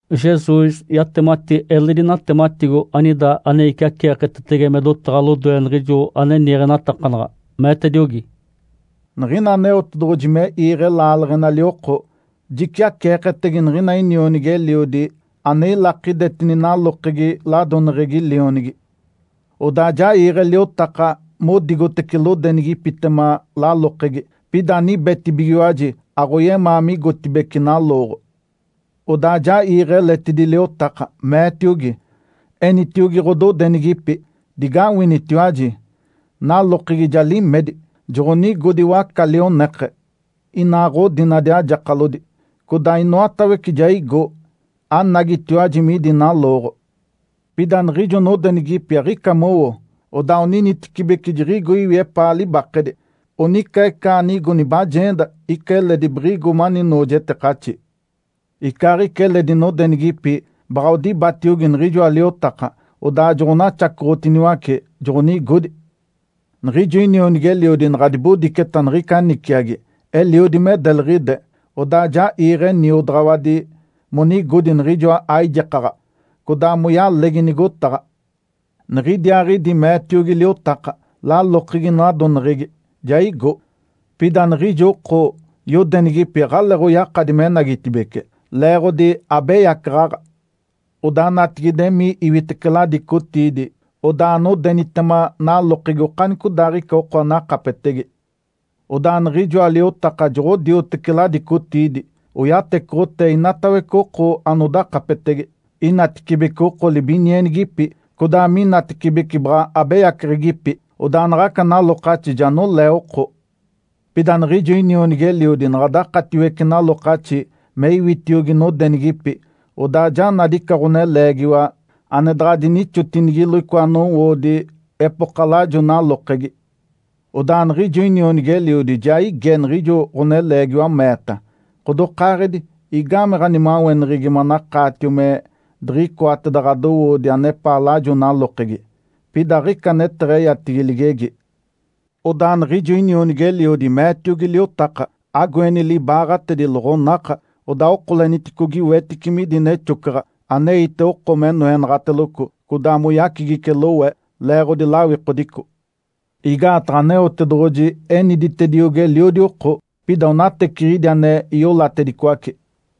Jesus yatemati eledi natematigo anida ane iciaceeketetege me dotaɡ̶a lodoe niɡ̶ijo ane niiɡ̶enatakanaɡ̶a, meetediogi, “Niɡ̶ina Aneotedoɡ̶oji me iiɡ̶e laaleɡ̶enali oko, jiciaceeketege niɡ̶ina inionigi-eliodi ane ilakidetini nalokegi ladoneɡ̶egi lionigi. Odaa ja iiɡ̶e liotaka modigotece lodenigipitema lalokegi. Pida anibetibigiwaji, aɡ̶oyemaa migotibeci nalooɡ̶o. Odaa ja iiɡ̶e eletidi liotaka, meetiogi, ‘Enitiogi ɡ̶ododenigipi, “Digawinitiwaji! Nalokegi ja limedi. Joɡ̶onigodi waca-lioneke, inaa ɡ̶odinadi ajakalodi, codaa inoatawece ja igo. Anagitiwaji midi nalooɡ̶o!” ’ Pida niɡ̶ijo nodenigipi aɡ̶ica mowo, odaa oninitecibeci jiɡ̶igo iwi epaa libakedi. Onica ica anigo nibajeenda, ica eledi biɡ̶igo mani noojetekaxi. Icaaɡ̶ica eledi nodenigipi baɡ̶a odibatiogi niɡ̶ijoa liotaka, odaa joɡ̶onaxacoɡ̶otiniwace, joɡ̶onigodi. Niɡ̶ijo inionigi-eliodi naɡ̶a dibodiceta niɡ̶ica niciagi, eliodi me deliɡ̶ide, odaa ja iiɡ̶e niodaɡ̶awadi monigodi niɡ̶ijoa aijekaɡ̶a, codaa moyalegi nigotaɡ̶a. Niɡ̶idiaaɡ̶idi meetiogi liotaka, ‘Lalokegi nadoneɡ̶egi ja igo, pida niɡ̶ijo oko yodenigipi aɡ̶aleeɡ̶oyakadi menagitibeci, leeɡ̶odi abeyacaɡ̶aɡ̶a. Odaa natigide, emii iwitece ladicotiidi, odaa anodenitema nalokegi okanicodaaɡ̶ica oko anakapetege.’ Odaa niɡ̶ijoa liotaka joɡ̶odioteci ladicotiidi, oyatecoɡ̶otee inatawece oko anodakapetege, inatecibece oko libinienigipi, codaa minatecibece baɡ̶a abeyaceɡ̶egipi. Odaa naɡ̶aca nalokaxi ja nolee oko. Pida niɡ̶ijo inionigi-eliodi naɡ̶a dakatiwece nalokaxi me iwitiogi nodenigipi, odaa ja nadi ica ɡ̶oneleegiwa ane daɡ̶a dinixotinigilo icoa nowoodi epoka lajo nalokegi. Odaa niɡ̶ijo inionigi-eliodi ja ige niɡ̶ijo ɡ̶oneleegiwa, meeta, ‘Ǥodokaaɡ̶edi, igame ɡ̶animaweneɡ̶egi manakaatio me diɡ̶icoateda ɡ̶adowoodi anepaa lajo nalokegi?’ Pida aɡ̶ica aneteɡ̶eyatigi ligegi. Odaa niɡ̶ijo inionigi-eliodi meetiogi liotaka, ‘Agoeni libaaɡ̶atedi, loɡ̶onaka, odaa okoleniticogi wetice midi nexocaɡ̶a, aneite oko me noenaɡ̶ateloco, codaa moyacigice lowe, leeɡ̶odi lawikodico.’ Igaataɡ̶a Aneotedoɡ̶oji eniditediogi eliodi oko, pida onateciɡ̶idi ane iolatedicoace.”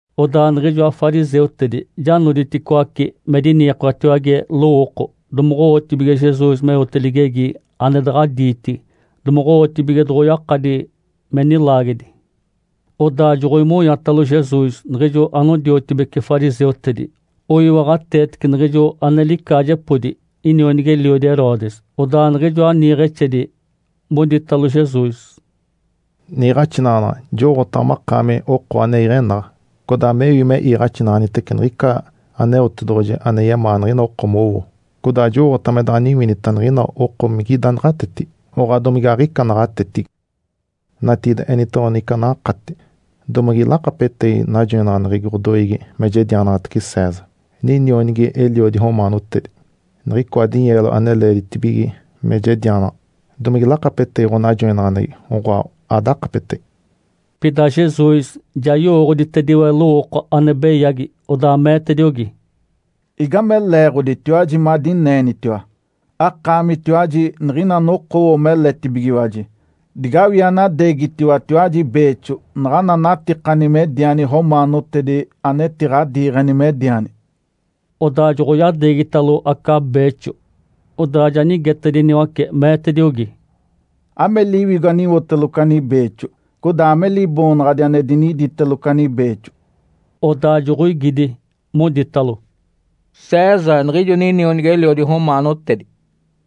Odaa niɡ̶ijoa fariseutedi ja noditicoaci me diniikoetiwage lowooko domoɡ̶owotibige Jesus meote ligegi ane daɡ̶a diitigi, domoɡ̶owotibige doɡ̶oyakadi me nilaagedi. Odaa joɡ̶oimonyatalo Jesus niɡ̶ijo anodiotibeci fariseutedi oiwaɡ̶ateetece niɡ̶ijo ane licaajepodi inionigi-eliodi Herodes. Odaa niɡ̶ijoa niiɡ̶exedi moditalo Jesus, “Niiɡ̶axinaɡ̶anaɡ̶a, jowooɡ̶otaɡ̶a makaami oko ane iɡ̶enaɡ̶a, codaa mewi me iiɡ̶axinaɡ̶anitece niɡ̶ica Aneotedoɡ̶oji ane yemaa niɡ̶ina oko mowo. Codaa jowooɡ̶otaɡ̶a me daɡ̶a aniwinita niɡ̶ina oko migida naɡ̶atetigi, oɡ̶oa domige aɡ̶ica naɡ̶atetigi. Natigide, enitoɡ̶owa niɡ̶ica anakati. Domige lakapetegi najoinaɡ̶aneɡ̶egi ɡ̶odoiigi me jedianaɡ̶atece César, ninionigi-eliodi romaanotedi, niɡ̶icoa dinyeelo ane leeditibige me jedianaɡ̶a? Domige lakapetegi ɡ̶onajoinaɡ̶aneɡ̶egi, oɡ̶oa, adakapetege?” Pida Jesus ja yowooɡ̶oditediwe lowooko ane beyagi, odaa meetediogi, “Igame leeɡ̶oditiwaji madineenitiwa? Akaamitiwaji niɡ̶ina anokowo meletibigiwaji. Digawii anadeegitiwatiwaji beexo naɡ̶ana anatikani mediani romaanotedi anetiɡ̶adiiɡ̶eni mediani.” Odaa joɡ̶oyadeegitalo aca beexo. Odaa ja nigetediniwace, meetediogi, “Ame liwigo aniwoteloco ani beexo? Codaa ame liboonaɡ̶adi ane diniditeloco ani beexo?” Odaa joɡ̶oigidi, moditalo, “César, niɡ̶ijo ninionigi-eliodi romaanotedi.”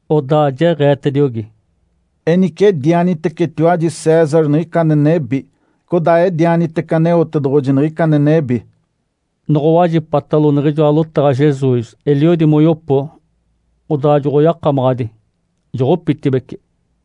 Odaa jeɡ̶eetediogi, “Enice edianitecetiwaji César niɡ̶ica ane nebi, codaa edianitece Aneotedoɡ̶oji niɡ̶ica ane nebi!” Noɡ̶owajipatalo niɡ̶ijoa lotaɡ̶a Jesus, eliodi moyopo. Odaa joɡ̶oyakamaɡ̶adi, joɡ̶opitibeci.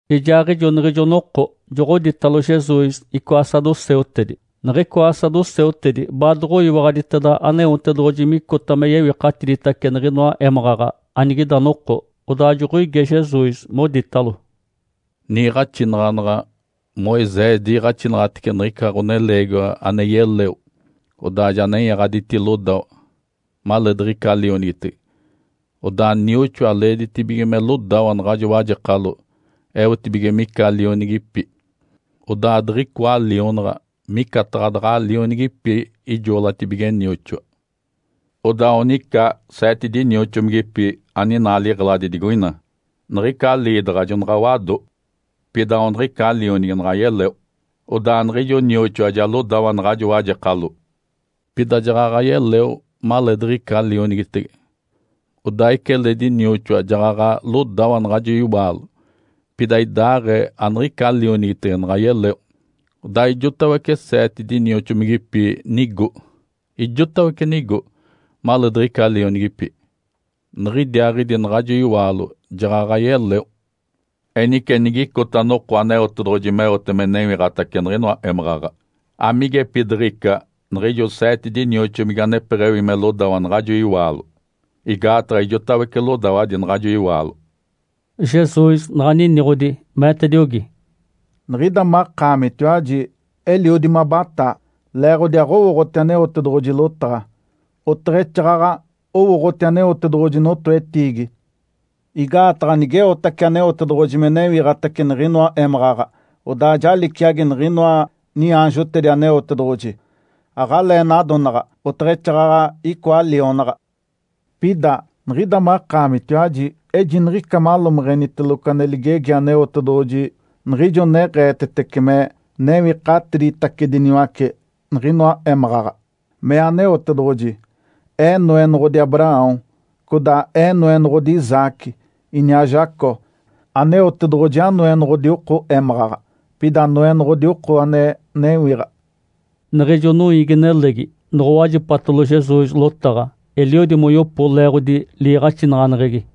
Ijaaɡ̶ijo niɡ̶ijo noko joɡ̶odiitalo Jesus icoa saduceutedi. Niɡ̶icoa saduceutedi baadoɡ̶oyiwaɡ̶aditeda Aneotedoɡ̶oji micota me yewikatiditace niɡ̶inoa émaɡ̶aɡ̶a anigida noko. Odaa joɡ̶oige Jesus, moditalo, “Niiɡ̶axinaɡ̶anaɡ̶a, Moisés diiɡ̶axinaɡ̶atece nigica ɡ̶oneleegiwa ane yeleo, odaa ja nenyaɡ̶aditi lodawa, maleediɡ̶ica lionigitege, odaa nioxoa leeditibige me lodawa naɡ̶ajo wajekalo eotibige mica lionigipi. Odaa diɡ̶icoa lionaɡ̶a micataɡ̶a daɡ̶a lionigipi ijoolatibige nioxoa. Odaa onica seete dinioxomigipi aninaa liɡ̶eladi digoina. Niɡ̶ica liidaɡ̶a jonaɡ̶a wado. Pida aona niɡ̶ica lionigi naɡ̶a yeleo. Odaa niɡ̶ijo nioxoa ja lodawa naɡ̶ajo wajekalo. Pida jaɡ̶aɡ̶a yeleo maleedaɡ̶aɡ̶ica lionigitege. Odaa ica eledi nioxoa jaɡ̶aɡ̶a lodawa naɡ̶ajo iwaalo. Pida idaaɡ̶ee aniɡ̶ica lionigitege naɡ̶a yeleo. Odaa ijotawece seete dinioxomigipi nigo. Ijotawece nigo maleediɡ̶ica lionigipi. Niɡ̶idiaaɡ̶idi naɡ̶ajo iwaalo jaɡ̶aɡ̶a yeleo. Enice, nigicota noko Aneotedoɡ̶oji meote me newiɡ̶atace niɡ̶inoa émaɡ̶aɡ̶a, amigepidiɡ̶ica niɡ̶ijo seete dinioxomigi anepeɡ̶ewi me lodawa naɡ̶ajo iwaalo? Igaataɡ̶a ijotawece lodawadi naɡ̶ajo iwaalo.” Jesus naɡ̶a niniɡ̶odi, meetediogi, “Niɡ̶ida makaamitiwaji eliodi mabataa leeɡ̶odi aɡ̶owooɡ̶oti Aneotedoɡ̶oji lotaɡ̶a, oteɡ̶exaaɡ̶aɡ̶a owooɡ̶oti Aneotedoɡ̶oji notoetiigi. Igaataɡ̶a nigeotace Aneotedoɡ̶oji me newiɡ̶atace niɡ̶inoa émaɡ̶aɡ̶a, odaa ja liciagi niɡ̶inoa niaanjotedi Aneotedoɡ̶oji. Aɡ̶alee nadonaɡ̶a, oteɡ̶exaaɡ̶aɡ̶a icoa lionaɡ̶a. Pida, niɡ̶ida makaamitiwaji ejiniɡ̶ica malomeɡ̶eniteloco ane ligegi Aneotedoɡ̶oji niɡ̶ijo neɡ̶eetetece me newikatiditacediniwace niɡ̶inoa émaɡ̶aɡ̶a. Mee Aneotedoɡ̶oji, ‘Ee Noenoɡ̶odi Abraão, codaa Ee Noenoɡ̶odi Isaque, iniaa Jacó.’ Aneotedoɡ̶oji aNoenoɡ̶odi oko émaɡ̶aɡ̶a, pida Noenoɡ̶odi oko ane newiɡ̶a.” Niɡ̶ijo noiigi-nelegi noɡ̶owajipatalo Jesus lotaɡ̶a, eliodi moyopo leeɡ̶odi liiɡ̶axinaɡ̶aneɡ̶egi.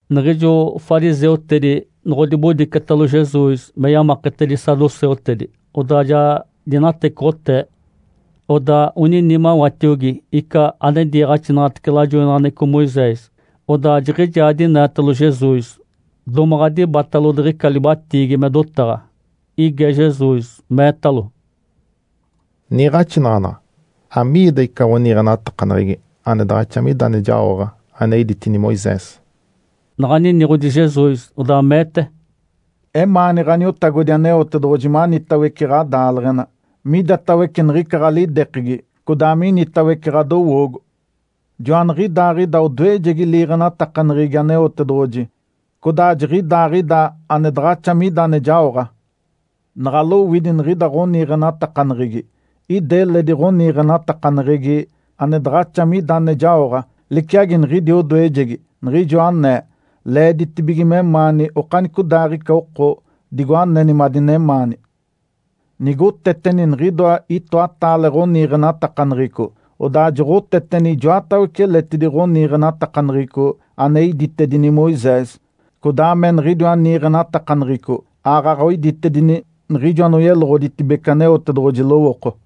Niɡ̶ijo fariseutedi noɡ̶odibodicetalo Jesus me yamaketedi saduceutedi. Odaa ja dinatecoɡ̶otee. Odaa onini mawatiogi ica ane diiɡ̶axinaɡ̶atece lajoinaɡ̶aneɡ̶eco Moisés. Odaa jiɡ̶ijaa dineetalo Jesus, domaɡ̶a dibatalo diɡ̶ica libatiigi me dotaɡ̶a. Ige Jesus, meetalo, “Niiɡ̶axinaɡ̶anaɡ̶a, amiida ica ɡ̶oniiɡ̶enatakaneɡ̶egi ane daɡ̶axa mida ane jaoɡ̶a ane iditini Moisés?” Naɡ̶a niniɡ̶odi Jesus, odaa meete, “‘Emaani Ǥaniotagodi Aneotedoɡ̶oji manitawece ɡ̶adaaleɡ̶ena, midatawece niɡ̶ica ɡ̶alidekegi, codaa minitawece ɡ̶adowoogo.’ Joaniɡ̶idaaɡ̶ida odoejegi liiɡ̶enatakaneɡ̶egi Aneotedoɡ̶oji, codaa jiɡ̶idaaɡ̶ida ane daɡ̶axa mida ane jaoɡ̶a. Naɡ̶a lowidi niɡ̶ida ɡ̶oniiɡ̶enatakaneɡ̶egi, ida eledi ɡ̶oniiɡ̶enatakaneɡ̶egi ane daɡ̶axa mida ane jaoɡ̶a, liciagi niɡ̶idi odoejegi. Niɡ̶ijo anee, ‘Leeditibige memaani okanicodaaɡ̶ica oko, digo aneni madinemaani.’ Nigoteteni niɡ̶idoa itoataale ɡ̶oniiɡ̶enatakaneɡ̶eco, odaa joɡ̶oteteni ijoatawece eletidi ɡ̶oniiɡ̶enatakaneɡ̶eco ane iditedini Moisés, codaa me niɡ̶idiwa niiɡ̶enatakaneɡ̶eco aaɡ̶aɡ̶a oiditedini niɡ̶ijo anoyeloɡ̶oditedibece Aneotedoɡ̶oji lowooko.”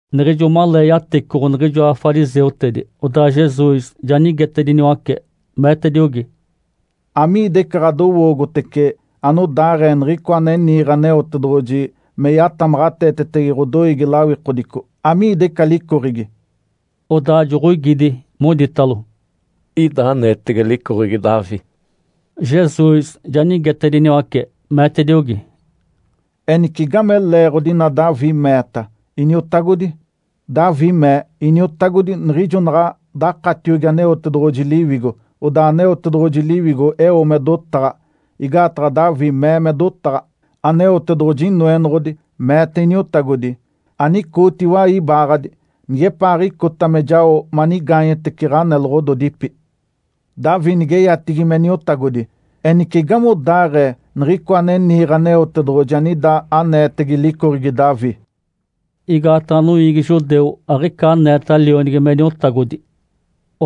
Niɡ̶ijo malee yatecoɡ̶o niɡ̶ijoa fariseutedi, odaa Jesus ja nigetediniwace, meetediogi, “Amiida ica ɡ̶adowoogotece anodaaɡ̶ee Niɡ̶icoa ane niiɡ̶e Aneotedoɡ̶oji me yatamaɡ̶ateetege ɡ̶odoiigi lawikodico? Amiida ica licoɡ̶egi?” Odaa joɡ̶oigidi, moditalo, “Ida aneetege licoɡ̶egi Davi.” Jesus ja nigetacediniwace, meetediogi, “Enice, igame leeɡ̶odi ina Davi meeta, ‘Iniotagodi’? Davi mee, ‘Iniotagodi’ niɡ̶ijo naɡ̶a dakatiogi Aneotedoɡ̶oji Liwigo, odaa Aneotedoɡ̶oji Liwigo eo me dotaɡ̶a. Igaataɡ̶a Davi mee me dotaɡ̶a, ‘Aneotedoɡ̶oji Inoenoɡ̶odi meete Iniotagodi, “Anicooti iwai ibaaɡ̶adi nigepaaɡ̶icota me jao manigaanyetece ɡ̶aneloɡ̶ododipi.” ’ Davi nigeyatigi me Niotagodi. Enice, igamodaaɡ̶ee Niɡ̶icoa ane niiɡ̶e Aneotedoɡ̶oji anida aneetege licoɡ̶egi Davi?” (Igaataɡ̶a noiigi judeu aɡ̶ica aneeta lionigi me Niotagodi.)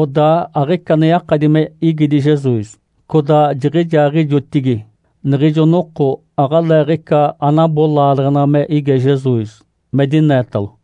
Odaa aɡ̶ica ane yakadi me igidi Jesus. Codaa jiɡ̶ijaaɡ̶ijotigi niɡ̶ijo noko aɡ̶aleeɡ̶ica anabo laaleɡ̶ena me ige Jesus me dineetalo.